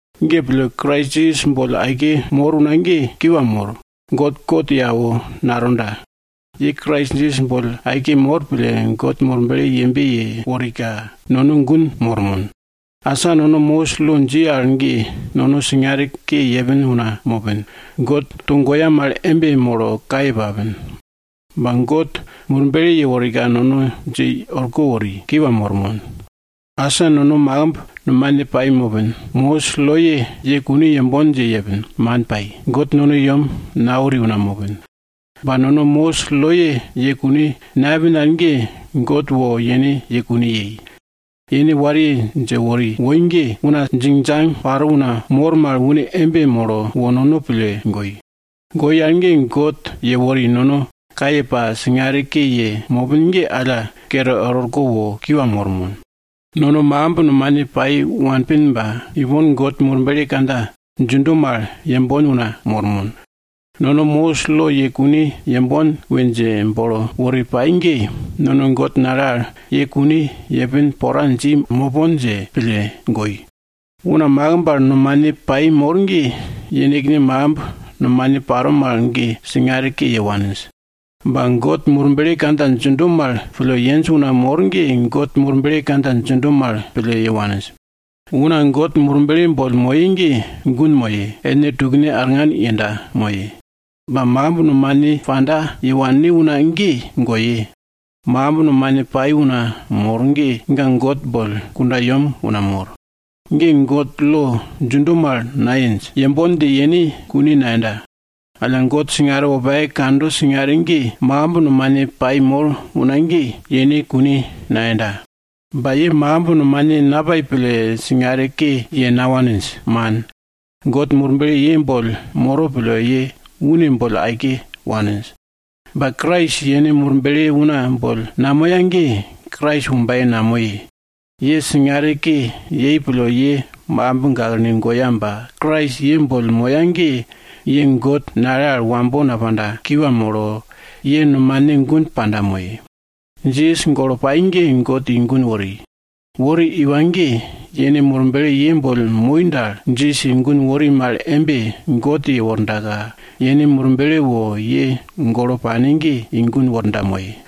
Ge pille, Krais Jisas boll aike mor una ge, kiwa mor, God kot ye awo natonda. Ye Krais Jisas boll aike mor pille, God Murble yembe yeworika, nono gun mormon. Asa nono Mosis lo dji al ge, nono singare ke yepin una mopin, God togoya mal embe molo kaye papin. Ba God Murble yeworika nono dje i orko wori, kiwa mormon. Asa nono makimb nomane pai mopin, Mosis loye ye kune yembon dje yepin, man pai. God nono i yem nawori una mopin. Ba nono Mosis loye ye kune nayepin al ge, God wo yene ye kune yei. Yene wariye dje wori woi ge, una djingdjang paro una mor mal une embe molo wo nono pille goi. Goi al ge, God yewori nono kaye pa singare ke ye mopin ge alla kere er orko wo kiwa mormon. Nono makimb nomane pai wanpin ba ipon God Murble kandja djindo mal yenmon una mormon. Nono Mosis lo ye kune yembon we dje bolo wori pai ge, nono God nale al ye kune yepin pora dji mopon dje pille goi. Una makimb al nomane pai mor ge, yenekne makimb nomane paro mal ge singare ke ye waninj. Ba God Murble kandja djindo mal pille yenj una mor ge, God Murble kandja djindo mal pille ye waninj. Una God Murble boll moye ge, gun moye, ellne tukne arngan yenda moye. Ba makimb nomane panda ye wanne una ge, goye. Makimb nomane pai una mor ge, ga God boll kundayem una mor. Ge God lo djindo mal nayenj, yembon dje yene kune nayenda. Alla God singare wopake kando singare ge, makimb nomane pai mor una ge, yene kune nayenda. Ba ye makimb nomane napai pille singare ke ye nawaninj, man. God Murble ye boll moro pille, ye une boll aike waninj. Ba Krais yene Murble una boll namoya ge, Krais wombaye namoye. Ye singare ke yei pille ye makimb gaklene goya ba Krais ye boll moya ge, ye God nale al wambo napanda, kiwa molo, ye nomane gun panda moye. Jisas golo pai ge God i gun wori. Wori iwa ge, yene Murble ye boll moi dal, Jisas i gun wori mal embe, God yewordaka, yene Murble wo ye golo pane ge i gun worda moye.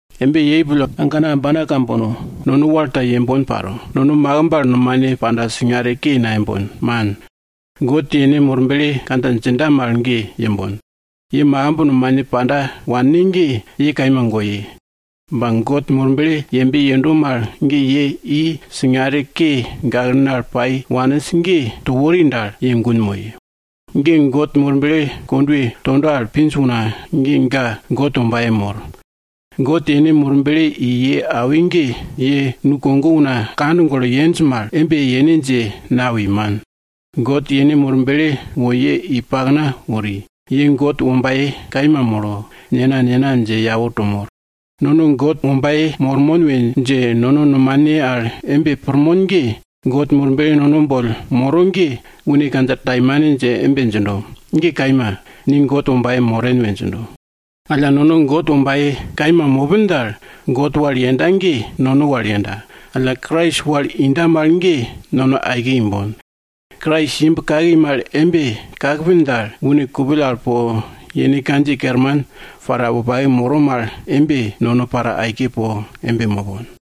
Embe paro pille, agana ambana kambono, nono wal ta yembon paro. Nono makimb al nomane panda singare ke nayembon, man. God yene Murble kandja djinda mal ge yembon. Ye makimb nomane panda wanne ge, ye kaima goye. Ba God Murble yembe yendo mal ge, ye i singare ke gaklene al pai waninj ge to wori dal, ye gun moye. God Murble kondwe tondo al pinj una ge, ga God wombaye mor. God yene Murble i ye awi ge, ye nukogo una kand golo yenj mal embe yene dje nawi, man. God yene Murble wo ye i pakna wori, ye God wombaye kaima molo, Nena, Nena dje yau to mor. Nono God wombaye mormon we dje nono nomane al embe pirmon ge, God Murble nono boll moro ge, une kandja taimane dje embe djindo, ge kaima, ni God wombaye moren we djindo. Alla nono God wombaye kaima mopin dal, God wal yenda ge, nono wal yenda, alla Krais wal inda mal ge nono aike imbon. Krais imb kaki mal embe kakpin dal, une kupill al po yene kandjiye kerman paraka wopake moro mal embe, nono para aike po embe mopon.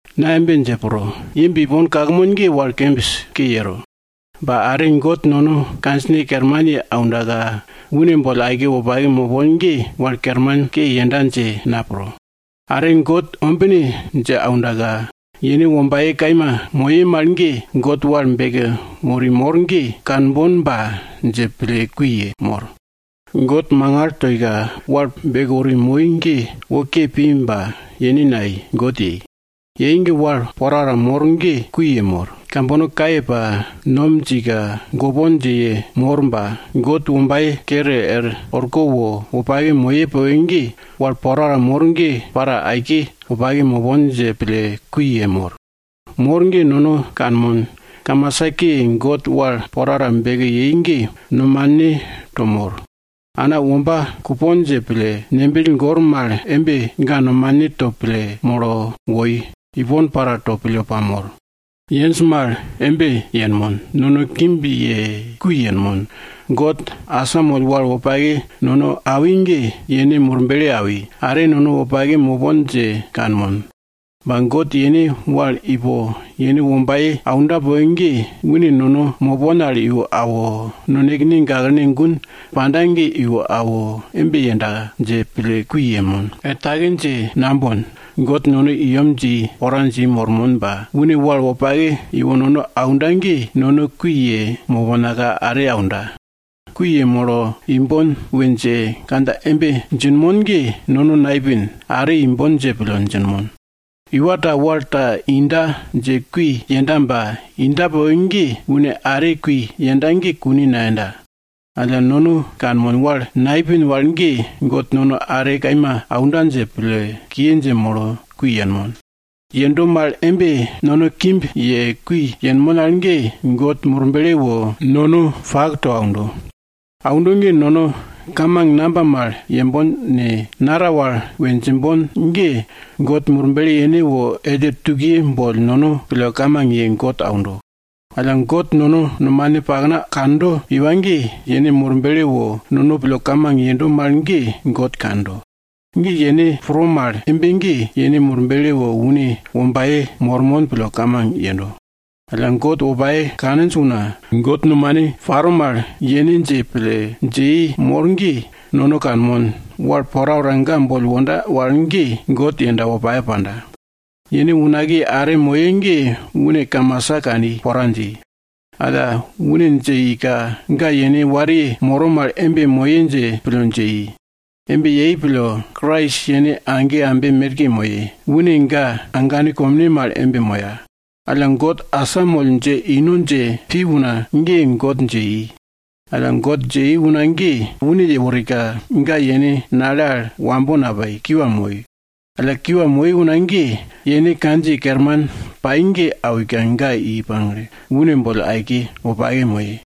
Na embe dje pro, ipon imb kakmon ge wal kembis ke yero. Ba are God nono kandjine kerman ye aundaka, une boll aike wopake mopon ge, wal kermanke yenda dje na pro. Are God ombine dje aundaka yene wombaye kaima moye mal ge God wal beke wori mor ge, kanbonba dje pille kui yemor. God mangal toika wal beke wori mor ge wo ke pi ba yenekne nayei, God yei. Yei ge wal porapora mor ge kui yemor. Kambono kaye pa, nom djindaka, gopon dje yemor ba, God wombaye kere er orko wo wopake moye poke ge, wal porapora mor ge para aike wopake mopon dje pille kui yemor. Mor ge nono kanmon, kamasa ke, God wal porapora beke yei ge nomane to mor. Ana womba kupon dje pille, ngembill gor mal embe ga nomane to pille molo woi, ipon para to pille pamor. Yenj mal embe yenmon. Nono kimb ye kui yenmon. God asamoll wal wopake nono awi ge, yene Murble awi, are nono wopake mopon dje kanmon. Ba God yene wal ipo yene wombaye aunda poke ge, une nono mopon al iwo awo, nonekene gaklene gun panda ge iwo awo, embe yenda dje pille kui yenmon. Er take dje nambon, God nono i yem dji pora dji mormon ba, une wal wopake iwo nono aunda ge nono kui yemoponka are aunda. Kui yemolo imbon we dje kandja embe djinmon ge, nono naipin, are imbon dje pille djinmon. Iwa ta wal ta ino dje kui yenda ba inda poke ge, une are kui yenda ge kune nayenda. Alla nono kanmon, wal naipin wal ge, God nono are kaima aunda dje pille kiye dje molo kui yenmon. Yendo mal embe, nono kimb ye kui yenmon al ge, God Murble wo nono pak to aundo. Aundo ge nono kamang namba mal yembon ne, naral wal we djimbon ge, God Murble yene wo elle tukiye boll nono pille kamang ye God aundo. Alla God nono nomane pakna kando iwa ge, yene Murble wo nono pille kamang yendo mal ge, God kando. Ge yene pro mal embe ge, yene Murble wo une wombaye mormon pille kamang yendo. Alla God wopake kaninj una, God nomane paro mal yene dje pille, dje i mor ge, nono kanmon, wal porapora ga boll wonda wal ge, God yenda wopake panda. Yene unakiye are moye ge une kamasa kani pora dji. Alla, une dje ika, ga yene wariye moro mal embe moye dje pille dje i. Embe yei pille, Krais yene age ambe merke moye, une ga agane komne mal embe moya. Alla God asamoll dje ino dje pi una ge, God dje i. Alla God dje i una ge, une yeworika, ga yene nale al wambo napai, kiwa moi. Alla kiwa moi una ge, yene kandjiye kerman pai ge awika ga i pagle, une boll aike wopake moye.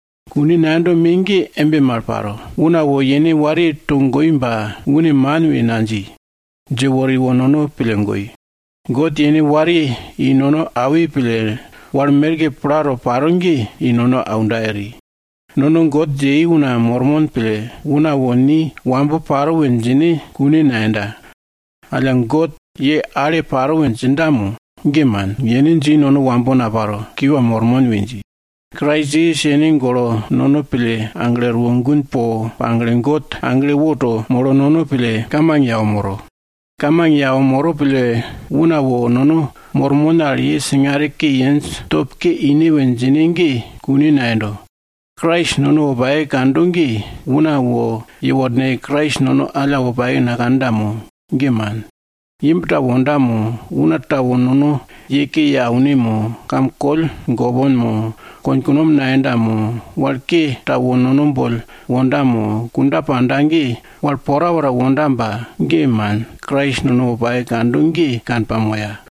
Kune nayendo me ge embe mal paro. Una wo yene wariye togoi ba une man we nadji. Dje wori wo nono pille goi. God yene wariye i nono awi pille, wal porapora plato paro ge i nono aunda eri. Nono God dje i una mormon pille, una wo ni wambo paro we djine kune nayenda. Alla, God ye ale paro we djinda mo? ge man, yene dji, nono wambo naparo, kiwa mormon we dji. Krais Jisas yene golo nono pille aglo erwo gun po pagle, God agle woto molo nono pille kamang ye awo moro. Kamang ye awo moro pille, una wo nono mormon al, ye singare ke yenj, top ke ine we djine ge kune nayendo. Krais nono wopake kando ge, una wo yeworneke Krais nono alla wopake nakanda mo? Ge man. Imb ta wonda mo, una ta wo nono ye ke ye aune mo, kam koll gopon mo, konkunom nayenda mo, wal ke ta wo nono boll wonda mo, kunda panda ge, wal porapora wonda ba, ge man, Krais nono wopake kando ge kanpamoya.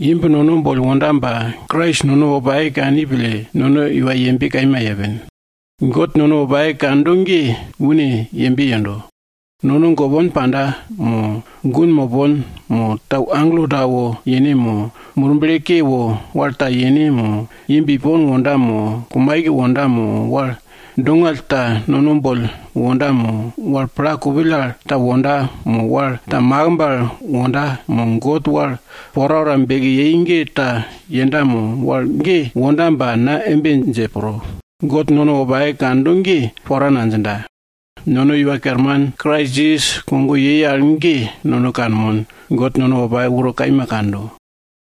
Imb nono boll wonda ba, Krais nono wopake kani pille, nono iwa yembe kaima yepin. God nono wopake kando ge une yembe yendo. Nono gopon panda, mo gun mopon, mo tau agelo ta wo yene mo, murble ke wo wal ta yene mo, imb ipon wonda mo, kumaike wonda mo, wal dongall ta nono boll wonda mo, wal pla kupill al ta wonda, mo wal ta makimb al wonda, mo God wal porapora beke yei ge ta yenda mo? Wal ge wonda ba na embe dje pro, God nono wopake kando ge pora nadjinda. Nono Iwa Kerman Krais Jisas kogo yei al ge nono kanmon, God nono wopake uro kaima kando.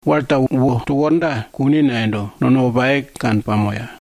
Wal ta wo to worda, kune nayendo, nono wopake kanpamoya.